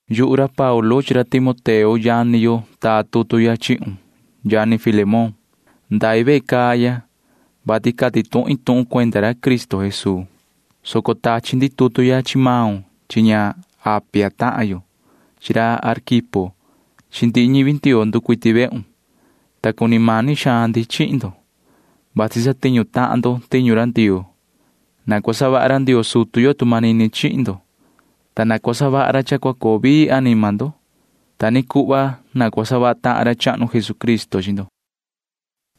Yuhu ra Paulu chi ra Timoteo yani yo taa tutu ya chihun, yoho yani Filemón. Ndai vehe caa ya, vati cati tuhin tuhun cuenda ra Cristo Jesuu, soco tachi ndi tutu ya chi maun chi ña Apia tahan yo chi ra Arquipo chi ndihi ñivi Ndioo nducuiti vehun, ta cuni mani xaan ndi chihin ndo, vati satiñu tahan ndo tiñu ra Ndioo. Na cua savaha ra Ndioo sutu yo tu manini chihin ndo, ta na cua savaha ra cha cua coo vii anima ndo. Ta ni cuhva na cua savaha tahan ra chahnu Jesucristo chi ndo.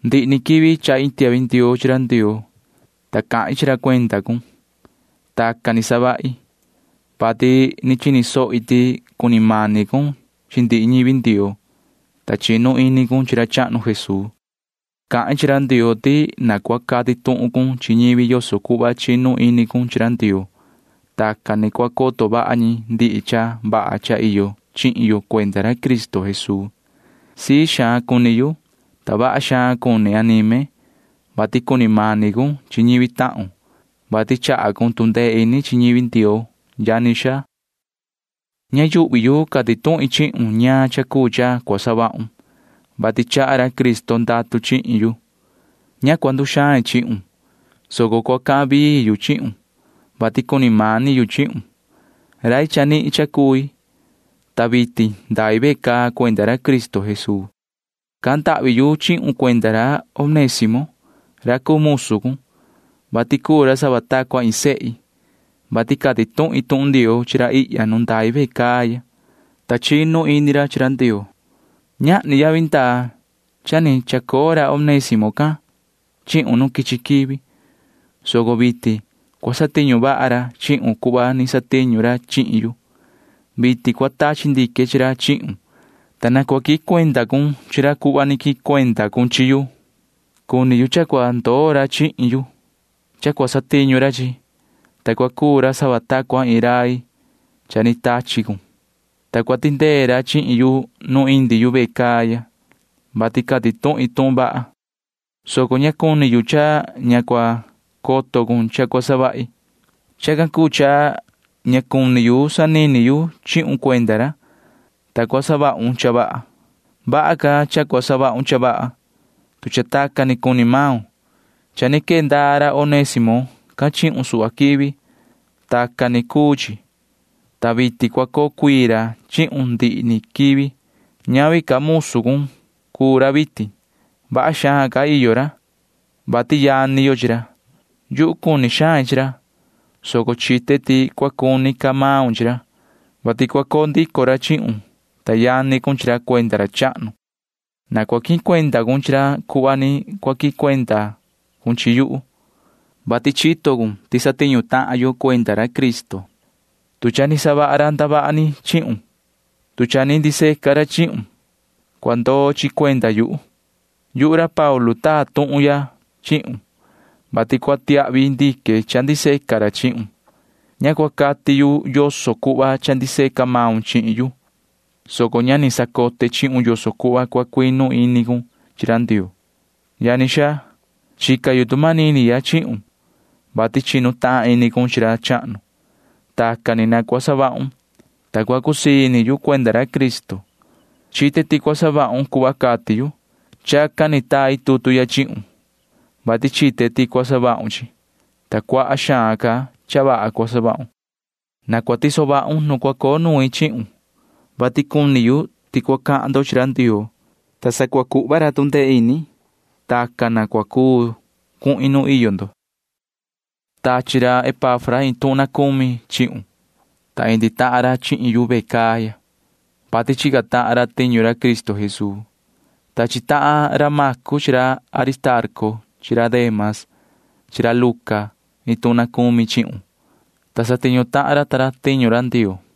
Ndihi ni quivi chahi iin tiahvi ndioo chi ra Ndioo, ta cahin chi ra cuenda cun. Tacan ni savahi, vati ni chini sohi ti cuni mani cun chi ndihi ñivi Ndioo, ta chinu ini cun chi ra chahnu Jesuu. Cahin chi ra Ndioo ti na cua cati tuhun cun chi ñivi yoso cuhva chinu ini cun chi ra Ndioo. Tacan ni cua coto vaha ñi ndihi cha vaha cha iyo chihin yo cuenda ra Cristo Jesuu. Sii xaan cuni yu, ta vaha xaan cuni anime, vati cuni mani cun chi ñivi tahun, vati chaha maun tu ndee ini chi ñivi Ndioo, yani xaa. Ña yuhvi yu cati tuhin chihun ñaan cha cuu cha cua savahun, vati chaha ra Cristo ndatu chihin yu. [Ña cua nduxain chihun,] soco cua cahan vii yu chihun, vati cuni mani yu chihun. Rai chanihin cha cui, ta vitin ndai ve caa cuenda ra Cristo Jesuu. Cahan ndahvi yu chihun cuenda ra Onésimo ra cuu musu cun, vati cuu ra sava ta cua iin sehi, vati cati tuhin tuhun Ndioo chi ra ihya nu ndai ve caa ya, ta chinu ini ra chi ra Ndioo. Ñahni yavi ndaa cha ni chacoo ra Onésimo can chihun nu quichi quivi, soco vitin cua satiñu vaha ra chihun cuhva ni satiñu ra chihin yu. Vitin cua tachi ndique chi ra chihun, [ta na cua quihin cuenda cun chi ra cuhva ni quihin cuenda cun chihin yu]. Cuni yu cha cua ndoo ra chihin yu. Chacan cuu cha cua cuu satiñu ra chihin yu, ta cua cuu ra sava ta cua iin rai cha ni tachi cun, ta cua tindee ra chihin yu cha indi yu ve caa, vati cati tuhin tuhun vaha, soco ña chito cun ti cha iyo ra chihin yu. Chacan cuu cha ña cuni yu sanini yu chihun cuenda ra, ta cua savahun cha vaha. Vaha ca cha cua savahun cha vaha, tu cha tacan ni cuni maun. Cha ni quee ndaa ra Onésimo can chihun suhva quivi. Vasi tacan cuu chi, vati vitin cua coo cuii ra chihun ndihi ni quivi. Ñavi ca musu cun cuu ra vitin. Vaha xaan ca iyo ra, vati yani yo chi ra. Yuhu cuni xain chi ra, soco chite ti cua cuni ca maun chi ra, vati cua coo ndico ra chihun, ta yani cun chi ra cuenda ra chahnu. Na cua quihin cuenda cun chi ra cuhva ni cua quihin cuenda cun chi yuhu, vati chito cun ti satiñu tahan yo cuenda ra Cristo. Tu cha ni savaha ra ndavaha ni chihun, tu cha ni ndiseca ra chihun, cua ndoo chi cuenda yuhu. Yuhu ra Paulu taa tuhun ya chihun, vati cua tiahvi ndique cha ndiseca ra chihun. Ña cua cati yu yoso cuhva cha ndiseca maun chihin yu, soco cha ni sacote chihun yoso cuhva cua cuinu ini cun chi ra Ndioo. Yani xaa, chica yu tu manini ya chihun, vati chinu tahan ini cun chi ra chahnu. Tacan ni na cua savahun, ta cua cusii ini yu cuenda ra Cristo. Chite ti cua savahun cuhva cati yu. Chacan ni tai tutu ya chihun, vati chite ti cua savahun cuhva cati yu, ta cuaha xaan ca cha vaha cua savahun. Na cua tiso vahun nu cua coo nuin chihun, vati cuni yu cha cua cahan ndo chi ra Ndioo, ta sa cua cuhva ra tu ndee ini, ta chacan ni cua cuu cuhin nu iyo ndo. Tachi ra Epafra iin tuhun na cumi chihun, ta indi tahan ra chihin yu ve caa ya, vati chica tahan ra tiñu Cristo Jesuu. Tachi tahan ra Macu chi ra Aristarco chi ra Dema chi ra Luca iin tuhun na cumi chihun, ta satiñu tahan ra ta ra tiñu Ndioo.